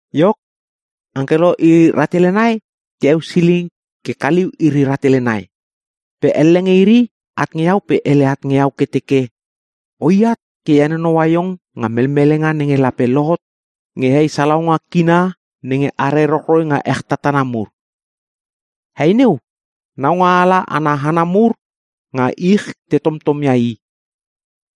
Iok, angkelo iri ratele nai te eusiling ke kaliu iri rahtele nai. Pe elle nge iri at nge iau pe hele at nge iau ke teke, “Oi at ke e henonoua iong nga melmelenga nenge lape lohot nge hei salaunga kina nenge are rochroi nga ech tatana mur. Hei neu, naungaala ana hana mur nga ich te tomtomia i.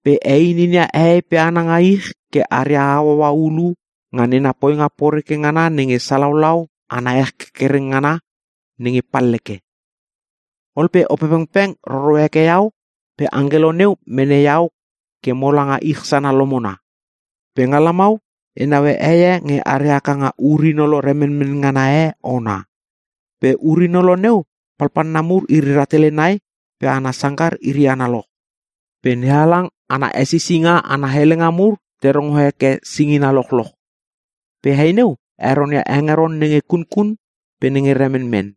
Pe heinia hehei pe hana nga ich ke aria hauaua hulu nga nena poinga poreke ngana nenge salaulau ana ech kerkereng ngana nenge palleke.” Ol pe Opepengpeng roro heke iau pe angkelo neu mene iau ke mola nga ich sana lomona. Pe nga lamau e naue heie nge are haka nga ur-inolo remenmen ngana e ona. Pe ur-inolo neu palpalna mur iri rahtele nai pe ana sangkar iri analoch. Pe NeHalang ana hesisinga ana helenga mur te rongo heke singina lochloch. Pe hei neu heronia hengeron nenge kunkun pe nenge remenmen.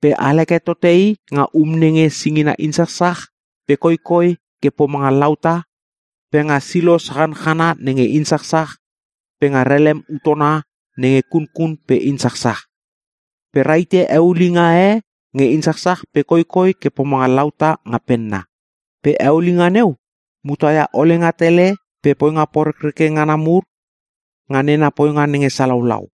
Pe alheke tote i nga um nenge singina insachsach, pe koikoi ke pomanga lauta, pe nga silo sachanchana nenge te insachsach, pe nga relem utona nenge kunkun pe insachsach. Pe rahite eulinga e nge insachsach pe koikoi ke pomanga lauta nga penna. Pe eulinga neu muta ia olenga tele pe poinga porekreke ngana mur nga nena poinga nenge salaulau.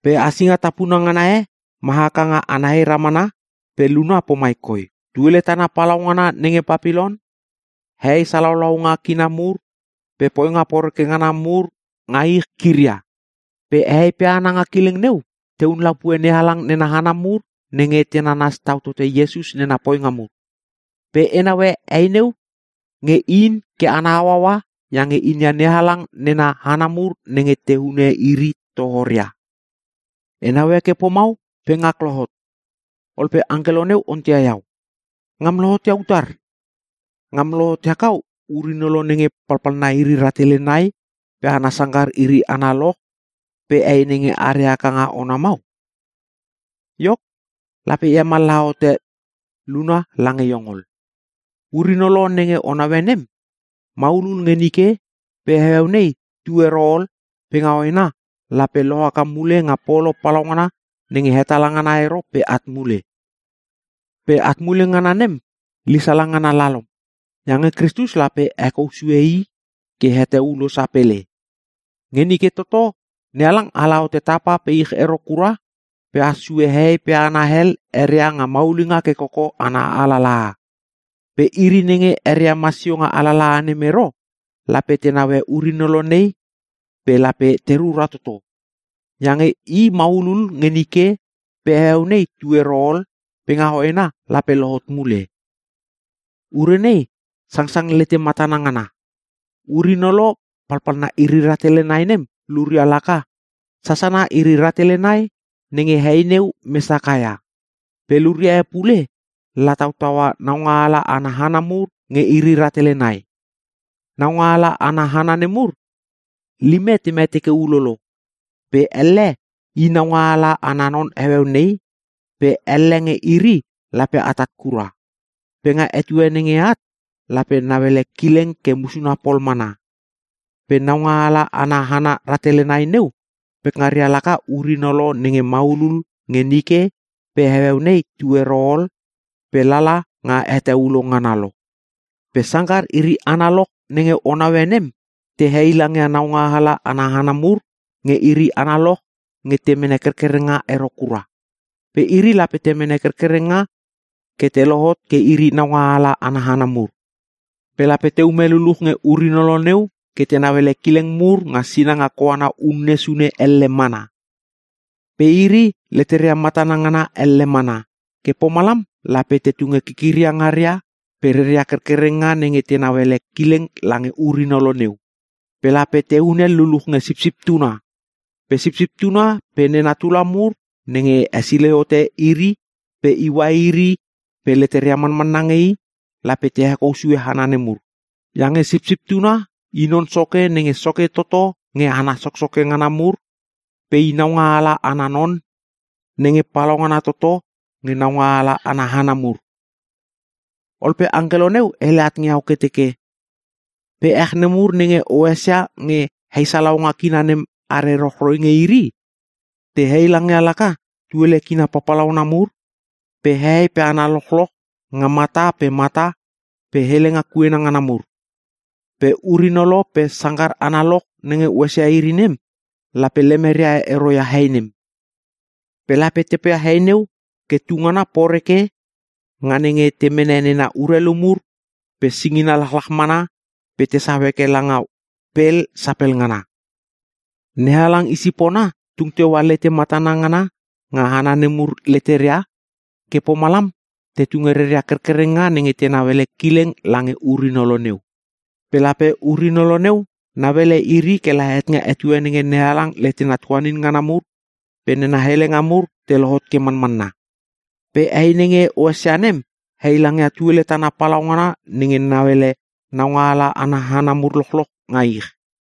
Pe hasinga tapuna ngana e ma haka nga ana hei ramana pe luna pomai koi: “TUELE TANA PALAUNGANA NENGE PAPILON, HEHEI SALAULAUNGA KINA MUR, PE POINGA POREKE NGANA MUR NGA ICH KIRIA.” Pe hehei pe hana nga kileng neu tehun lapue NeHalang nena hana mur nenge te nanas tau tote Iesus nena poinga mur. Pe e naue hei neu nge in ke ana hauaua iange inia NeHalang nena hana mur nenge te hune iri tohoria. E naue ke pomau pe ngak lohot. Ol pe angkelo neu onteia iau, “Ngam lohot ia utar? Ngam lohot ia kau ur-inolo nenge palpalna iri rahtele nai pe ana sangkar iri analoch pe hei nenge are haka nga ona mau? Iok, lape e hemallaha hote luna lange iong ol. Ur-inolo nenge o naue nem, maulul nge nike pe heueu nei tu ero ol pe nga hoena lape lohaka mule nga polo palaungana nenge hetala ngana ero pe at mule. Pe at mule ngana nem lisala ngana lalom, iange Kristus lape hekou sue i ke het heulo sapele. Nge nike toto NeHalang ala hote tapa pe ich ero kura pe has sue hehei pe hana hel eria nga maulinga ke koko ana alalaha. Pe iri nenge eria masio nga alalaha nem ero lape te naue ur-inolo nei pe lape te rura toto. Iange i maulul nge nike pe heueu nei tu ero ol pe nga hoena lape lohot mule. “Ure nei sangsang lete matana ngana. Ur-inolo palpalna iri rahtele nai nem luria laka: Sasana iri rahtele nai nenge hei neu mes hakaka ia. Pe luria e pule lataua naungaala ana hana mur nge iri rahtele nai. Naungaala ana hana nemur lime te mete ke ulolo, pe elle i naungaala ana non heueu nei, pe elle nge iri lape atat kura. Pe nga etue nenge at lape nauele kileng ke musuna pol mana. Pe naungaala ana hana rahtele nai neu pekngaria laka ur-inolo nenge maulul nge nike pe heueu nei tu ero ol pe lala nga het heulo ngana lo. “Pe sangkar iri analoch nenge o naue nem te heilangia naungaala ana hana mur nge iri analoch nge te mene kerkerenga ero kura. Pe iri lape te mene kerkerenga ke te lohot ke iri naungaala ana hana mur. Pe lape teume luluch nge ur-inolo neu ke tenau ele kileng mur nga sinanga koana unne sune elle mana. Pe iri leteria matana ngana elle mana. Ke pomalam lape te tunge kikiria ngaria pe reria kerkerenga nenge tenau ele kileng lange ur-inolo neu. Pe lape te hunel luluch nge Sipsip Tuna. Pe Sipsip Tuna pe nena tula mur nenge hesilei hote iri pe iua iri pe leteria manmanna nge I, lape te hekou sue hana nemur. Iange Sipsip Tuna i Non Soke nenge soke toto nge hana soksoke ngana mur pe I Naungaala ana non nenge palaungana toto nge naungaala ana hana mur.” Ol pe angkelo neu hele at nge iau ke teke, “Pe ech nemur nenge o esia nge hei salaunga kina nem are rochroi nge iri, te heilangia laka tuele kina papalauna mur, pe hehei pe hana lochloch nga mata pe mata, pe helenga kuena ngana mur. Pe ur-inolo pe sangkar analoch nenge o esia iri nem lape lemeria ero ia hei nem. Pe lape te poia hei neu ke tungana poreke nga nenge te mene nena urelu mur pe singina lachlach mana pe tesau heke i langa pel sapel ngana. NeHalang i sipona tung teua lete matana ngana nga hana nemur leteria, ke pomalam te tunge reria kerkerenga nenge tenau ele kileng lange ur-inolo neu. Pe lape ur-inolo neu nauele iri kela het nga etue nenge NeHalang letena tuanin ngana mur pe nena helenga mur te lohot ke manmanna. Pe hei nenge o esia nem heilangia tuele tana palaungana nenge nauele naungaala ana hana mur lochloch nga ich.”